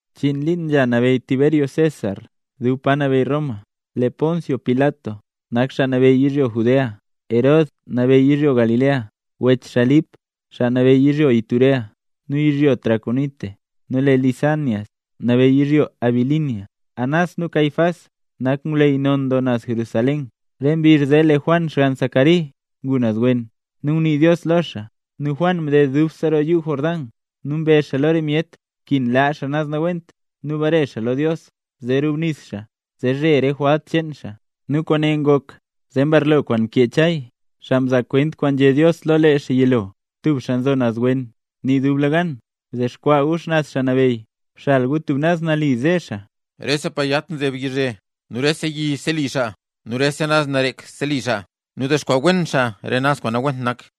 Chiin liin nzha nabeyy Tiberio César dub pa nabeyy Roma, lee Poncio Pilat nak xaa nabeyy yizhyo Judea, Herod nabeyy yizhyo Galilea, wech xaa nak Lip xaa nabeyy yizhyo Iturea nu yizhyo Traconite, nu lee Lisanias nabeyy yizhyo Abilinia. Anás nu Caifás nak ngwleyy non doo naz Jerusalén. Re mbizh zee lee Juan xgann Zacari ngu naz wen, nu ngunii Dios lo xaa. Nu Juan mded dubse roo yuu Jordán, nu mbezh xaa lo rese myet nkin laa xaa naz nawent nu bare xaa lo Dios zee rubnis xaa, zee zhe re jwalt cheen xaa. Nu kwaane ngok zee mbarlo kwaan mkee Chay, xaa mzaa kwent kwaan nzhé Dios lo lee xaa yilo: Tub xaa nzo naz wen nii dublegan: “Bdexkwaa gu xnaz Xaa Nabeyy; bxal gu tub naz nali zee ze xaa.” Rese pa yat nzeb yizhe, nu rese yi nu rese lom seli xaa nu rese naz narek seli xaa. Nu dexkwaa wen xaa re naz kwaan nawent nak.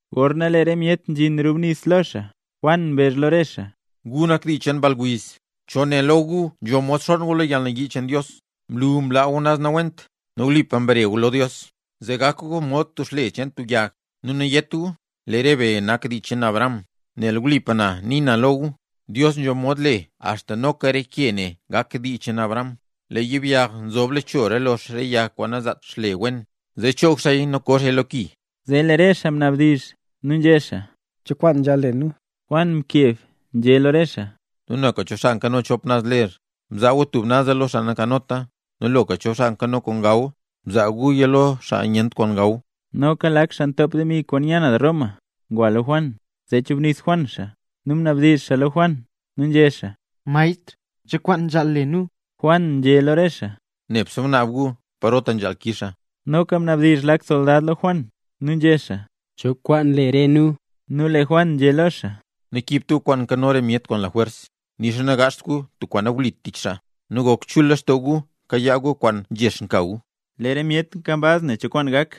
Gorna lee re myet nzhin rubnis xaa lo xaa, Juan mbezh lo re xaa: —¡Gu nak dii cheen mball wiz! ¿Cho né lo gu nzho mod xonn gu lo yalnayii kwaan né Dios yaad? Blu mlaa gu naz nawent nu wlipa mbare gu naz lo Dios, zee gakpa gu mod xle cheen tub yag. Nu nawdizht gu yé gu: “¡Lee re be nak dii cheen Abraham!” Nel wlipa na nii na lo gu, Dios nzho mod le axta noka re ke ne gaka dii cheen Abraham. Lee yibyag nzobla cho lox re yag kwaan nanzaat xle wen, zee choog xaaya nu koo xaaya lo ki. Zee lee re xaa mnabdizh nu nzhé xaa: —¿Cho kwaan nzhaal le nu? Juan mkeb nzhé lo re xaa: —Nu loka cho xaa nkano chop naz ler, bzaa gu tub naza lo xaa nankanota, nu loka cho nkano kwaan gaw, bzaa guya lo xaa nyent kwaan gaw. Noka lak xaa ntop demi kwaan nya naz Roma ngwa lo Juan, zee chubnis Juan xaa, nu mnabdizh xaa lo Juan nu nzhé xaa: —Maestr, ¿cho kwaan nzhaal le nu? Juan nzhé lo re xaa: —Nebse gunaab gu parota nzhaal kix xaa. Noka mnabdizh lak soldad lo Juan, nu nzhé xaa: —¿Cho kwaan le re nu? Nu lee Juan nzhé lo xaa: —Nakiibt gu kwaan nkano re myet kwaan lajwers, nixa nagaazht gu tub kwaan nawlit tich xaa; nu nebse gok chul lextoo gu kayaa gu re demi kwaan nzhex nka gu. Lee re myet nkambaz nen cho kwaan gak.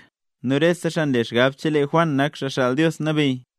Nu rese xaa nle xgab chelee Juan nak Xaa Xaal Dios Nabeyy.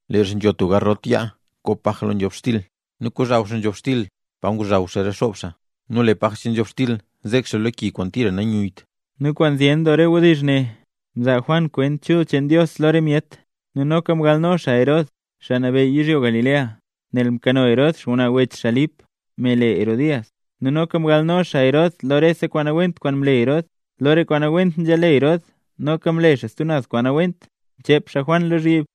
Lee xaa nzho tub garot yaa koo paj lo nzhobxtil, nu kozhaw xaa nzhobxtil pa ngozhaw xaa re xob xaa, nu lee paj nzhobxtil zek xaa lo ki kwaan tira nanyuyyt. Nu kwaan zyen doo re wdizh ne mzaa Juan kwent chul cheen Dios lo re myet. Nu noka mgalno xaa Herod, xaa nabeyy yizhyo Galilea, nel mkano Herod xngwnaa wech xaa Lip, me le Herodías, nu noka mgalno xaa Herod lo rese kwaan nawent kwaana mle Herod. Lo re kwaan nawent nzhale Herod, noka mle xaa stub kwaan nawent, mchep xaa Juan lozhyib.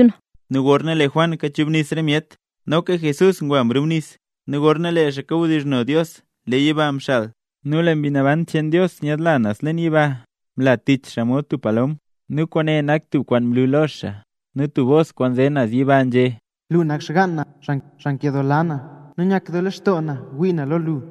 Nu gorna lee Juan kachubnis re myet, noka Jesús ngwa mrubnis; nu gorna lee xaa kawdizhno Dios lee yiba mxal, nu lee Mbi Naban cheen Dios nyaadla naz leen yiba mla tich xaa mod tub palom, nu kwaane nak tub kwaan mlu lo xaa. Nu tub bos kwaan nze naz yiba nzhé: —Lu nak xgaan na, xaa nkedoola na, nu nyakdoo lextoo na wii na lo lu.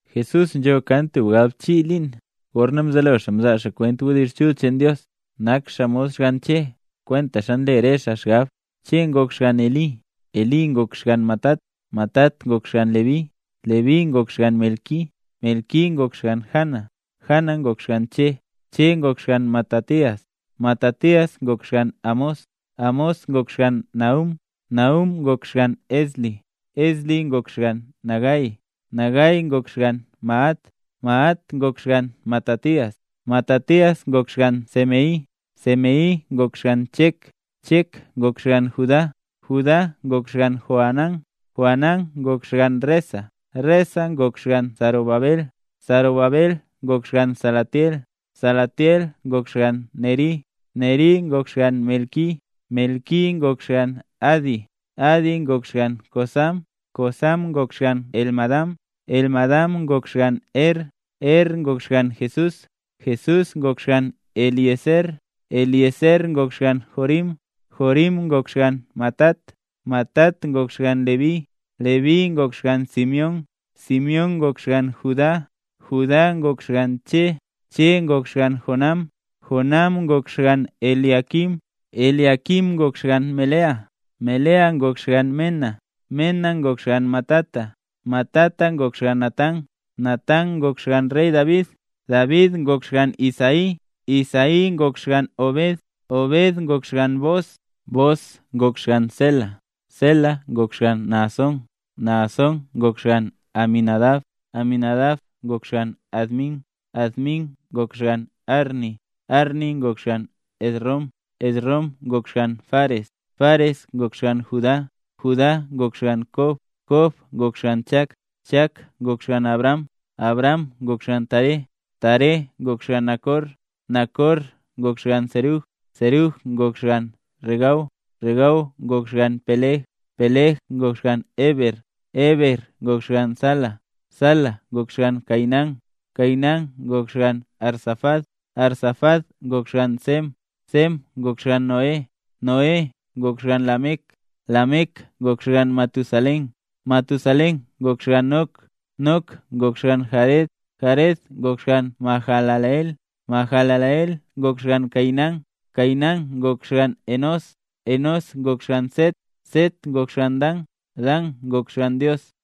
Jesús nzho kan tub galbchii liin gorna mzelo xaa mzaa xaa kwent wdizh chul cheen Dios. Nak xaa mod xgann Che, kwentaxa nle re xaa xgab. Che ngok xgann Elí, Elí ngok xgann Matat, Matat ngok xgann Leví, Leví ngok xgann Melqui, Melqui ngok xgann Jana, Jana ngok xgann Che, Che ngok xgann Matatías, Matatías ngok xgann Amós, Amós ngok xgann Nahúm, Nahúm ngok xgann Esli, Esli ngok xgann Nagai, Nagai ngok xgann Maat, Maat ngok xgann Matatías, Matatías ngok xgann Semei, Semei ngok xgann Chek, Chek ngok xgann Judá, Judá ngok xgann Joanán, Joanán ngok xgann Resa, Resa ngok xgann Zorobabel, Zorobabel ngok xgann Salatiel, Salatiel ngok xgann Neri, Neri ngok xgann Melqui, Melqui ngok xgann Adi, Adi ngok xgann Cosam, Cosam ngok xgann Elmadam, Elmadam ngok xgann Er, Er ngok xgann Jesús, Jesús ngok xgann Eliezer, Eliezer ngok xgann Jorim, Jorim ngok xgann Matat, Matat ngok xgann Leví, Leví ngok xgann Simeón, Simeón ngok xgann Judá, Judá ngok xgann Che, Che ngok xgann Jonam, Jonam ngok xgann Eliaquim, Eliaquim ngok xgann Melea, Melea ngok xgann Mená, Mená ngok xgann Matata, Matata ngok xgann Natán, Natán ngok xgaan rey David, David ngok xgann Isaí, Isaí ngok xgann Obed, Obed ngok xgann Booz, Booz ngok xgann Sélah, Sélah ngok xgann Naasón, Naasón ngok xgann Aminadab, Aminadab ngok xgann Admín, Admín ngok xgann Arní, Arní ngok xgann Esrom, Esrom ngok xgann Fares, Fares ngok xgann Judá, Judá ngok xgann Kob, Kob ngok xgann Chak, Chak ngok xgann Abraham, Abraham ngok xgann Taré, Taré ngok xgann Nacor, Nacor ngok xgann Serug, Serug ngok xgann Ragau, Ragau ngok xgann Peleg, Peleg ngok xgann Heber, Heber ngok xgann Sala, Sala ngok xgann Cainán, Cainán ngok xgann Arfaxad, Arfaxad ngok xgann Sem, Sem ngok xgann Noé, Noé ngok xgann Lamec, Lamec ngok xgann Matusalén, Matusalén ngok xgann Nok, Nok ngok xgann Jared, Jared ngok xgann Mahalaleel, Mahalaleel ngok xgann Cainán, Cainán ngok xgann Enós, Enós ngok xgann Set, Set ngok xgann Dan, Dan ngok xgann Dios.